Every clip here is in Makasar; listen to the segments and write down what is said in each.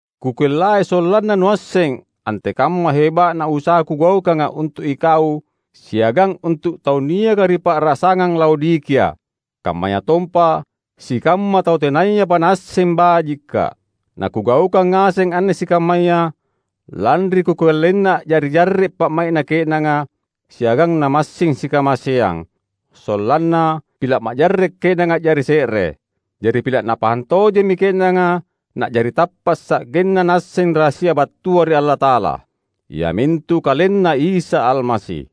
Kukellai sollanna nuasseng antekamma heba’na usaha kugaukanga untu’ ikau siagang untu’ tau niaka ri pa’rasangang Laodikia, kammayatompa sikamma tau tenayapa naasseng bajikka’. Nakugaukang ngaseng anne sikammaya, lanri kukellaina a’jari jarre’ pa’mai’na ke’nanga siagang namassing sikamaseang, sollanna pila’ majarre’ ke’nanga a’jari se’re. Jari pila’ napahang tojemmi ke’nanga na’jari tappa’ sa’genna naasseng rahasia battua ri Allata’ala, iamintu KalenNa Isa Almasi.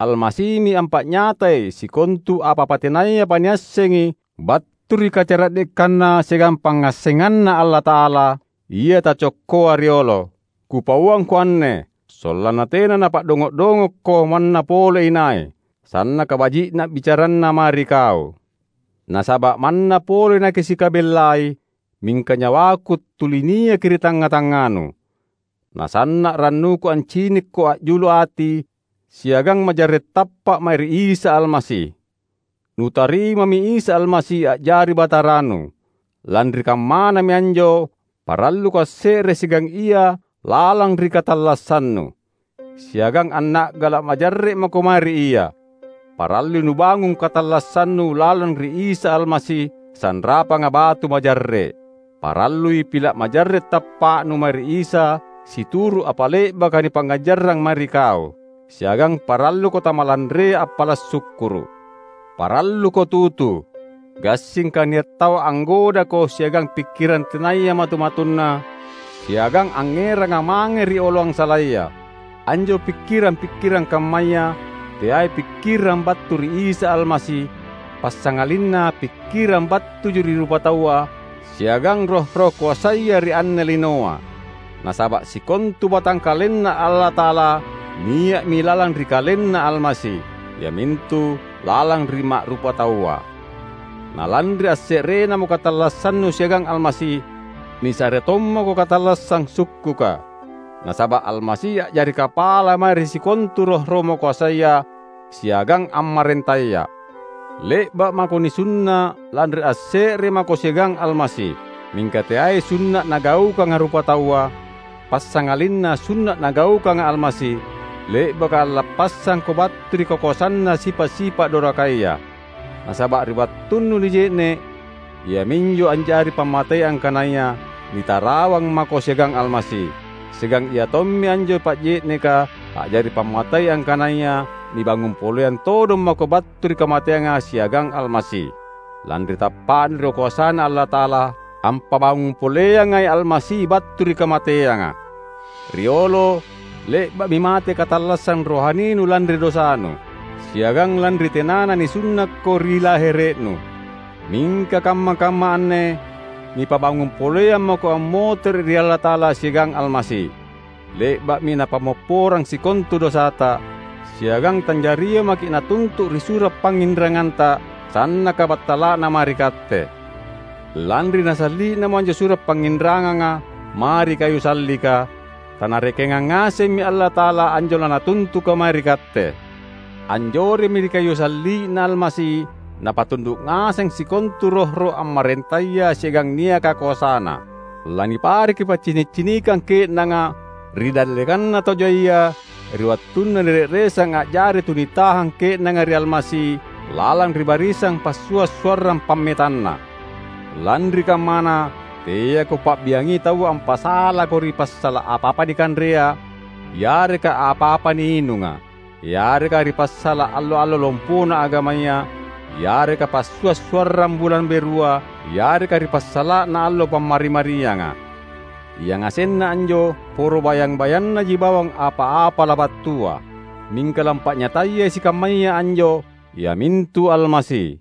Almasimi ampa’nyatai sikontu apa-apa tenayapa niassengi battu ri kacara’dekanNa siagang pangngassenganNa Allata’ala, ia taccokkoa riolo. Kupauangko anne, sollanna tena napa’dongo’-dongokko manna pole inai, sannaka baji’na bicaranna mae ri kau. Nasaba’ manna pole nakisikabellai, mingka nyawaku tuli niaki ri tangnga-tangnganu. Na sanna’ rannuku ancinikko a’julu ati siagang majarre’ tappa’ mae ri Isa Almasi. Nutarimami Isa Almasi a’jari Bataranu. Lanri kammanami anjo paralluko asse’re siagang Ia lalang ri katallassannu, siagang anna’gala’ majarre’ mako mae ri Ia. Parallui nubangung katallassannu lalang ri Isa Almasi, sanrapanga batu majarre’. Parallui pila’ majarre’ tappa’nu mae ri Isa situru’ apa le’baka nipangngajarrang mae ri kau. Siagang paralluko tamalanrea appala’ sukkuru’. Paralluko tutu, gassingka nia’ tau anggodako siagang pikkirang tenaya matu-matunna siagang angngeranga mange ri oloang salaya. Anjo pikkirang-pikkirang kammaya teai pikkirang battu ri Isa Almasi, passangalinna pikkirang battuji ri rupataua siagang roh-roh koasaya ri anne linoa. Nasaba’ sikontu batangkalenNa Allata’ala nia’mi lalang ri KalenNa Almasi, iamintu lalang ri ma’rupataua. Na lanri asse’renamo katallassannu siagang Almasi, nisare tommako katallassang sukkuka. Nasaba’ Almasi a’jari kapala mae ri sikontu roh-roh makoasaya siagang ammarentaya. Le’ba’ mako nisunna’ lanri asse’re mako siagang Almasi; mingka teai sunna’ nagaukanga rupataua, passangalinna sunna’ Nagaukanga Almasi, le’baka allappassangko battu ri kakoasanna sipa’-sipa’ dorakaya. Nasaba’ ri wattunnu nije’ne’, iaminjo a’jari pammatei angkanaya nitarawang mako siagang Almasi; siagang iatommi anjo pa’je’neka a’jari pammatei angkanaya nibangung poleang todong mako battu ri kamateanga siagang Almasi, lanri tappa’nu ri koasaNa Allata’ala, ampabangung poleangai Almasi battu ri kamateanga. Riolo, le’ba’mi mate katallassang rohaninu lanri dosanu, siagang lanri tenana nisunnakko ri lahere’nu. Mingka kamma-kamma anne nipabangung poleang mako ammotere’ ri Allata’ala siagang Almasi. Le’ba’mi Napammopporang sikontu dosata, siagang tanjaria maki’ natuntu’ ri sura’ pangnginranganta, sannaka battala’na mae ri katte. Lanri nasalli’namo anjo sura’ pangnginranganga mae ri kayu sallika, taNarekenga ngasemmi Allata’ala anjo laNatuntuka mae ri katte. Anjoremmi ri kayu salli’Na Almasi Napatundu’ ngaseng sikontu roh-roh ammarentaya siagang niaka koasana. Lanipareki paccini’-cinikang ke’nanga ri dallekanna tau jaia ri wattunna nire’resang a’jari tu nitahang ke’nanga ri Almasi lalang ri barisang passua’-suarrang pammetanNa. Lanri kammana, teako pa’biangi taua ampasalako ri passala’ apa-apa nikanrea yareka apa-apa niinunga, yareka ri passala’ allo-allo lompona agamaya, yareka passua’-suarrang bulang berua, yareka ri passala’na allo Pammari-marianga. Yangasenna anjo poro bayang-bayannaji bawang apa-apa labattua; mingka lampa’nyatayai sikammaya anjo iamintu Almasi!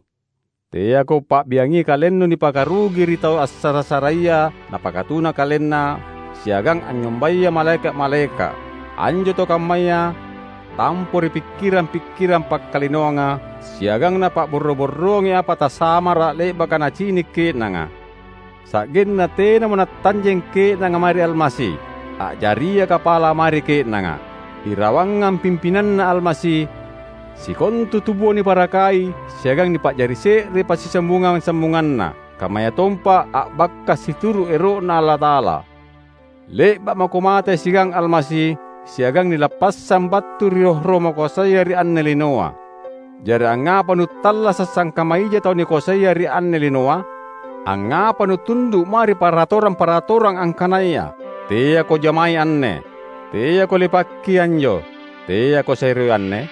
Teako pa’biangi kalennu nipakarugi ri tau assara-saraia napakatuna kalenna siagang anynyombaya malaeka’-malaeka’. Anjo tau kammaya tampoi ri pikkirang-pikkirang pakkalinoanga siagang napa’borro-borroangi apa tasamara’ le’baka nacini’ ke’nanga; sa’genna tenamo natanjeng ke’nanga mae ri Almasi, a’jaria kapala mae ri ke’nanga. Irawangang pimpinanNa Almasi, sikontu tubua niparakai siagang nipa’jari se’re ri passisambung-sambunganna, kammayatompa a’bakka’ situru’ ero’Na Allata’ala. Le’ba’ mako mate siagang Almasi, siagang nilappassang battu ri roh-roh makoasaya ri anne linoa. Jari, angngapa nuttallasa’ sangkamma ija tau nikoasaia ri anne linoa? Angngapa nutundu’ mae ri paratorang-paratorang angkanaya, "Teako jamai anne," "teako lepakki anjo," "teako seroi anne"?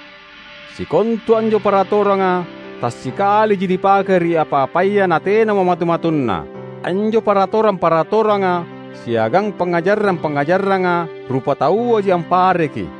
Sikontu anjo paratoranga tassikaliji nipake ri apa-apaya natenamo matu-matunna. Anjo paratorang-paratoranga siagang pangngajarang-pangngajaranga rupatauaji ampareki.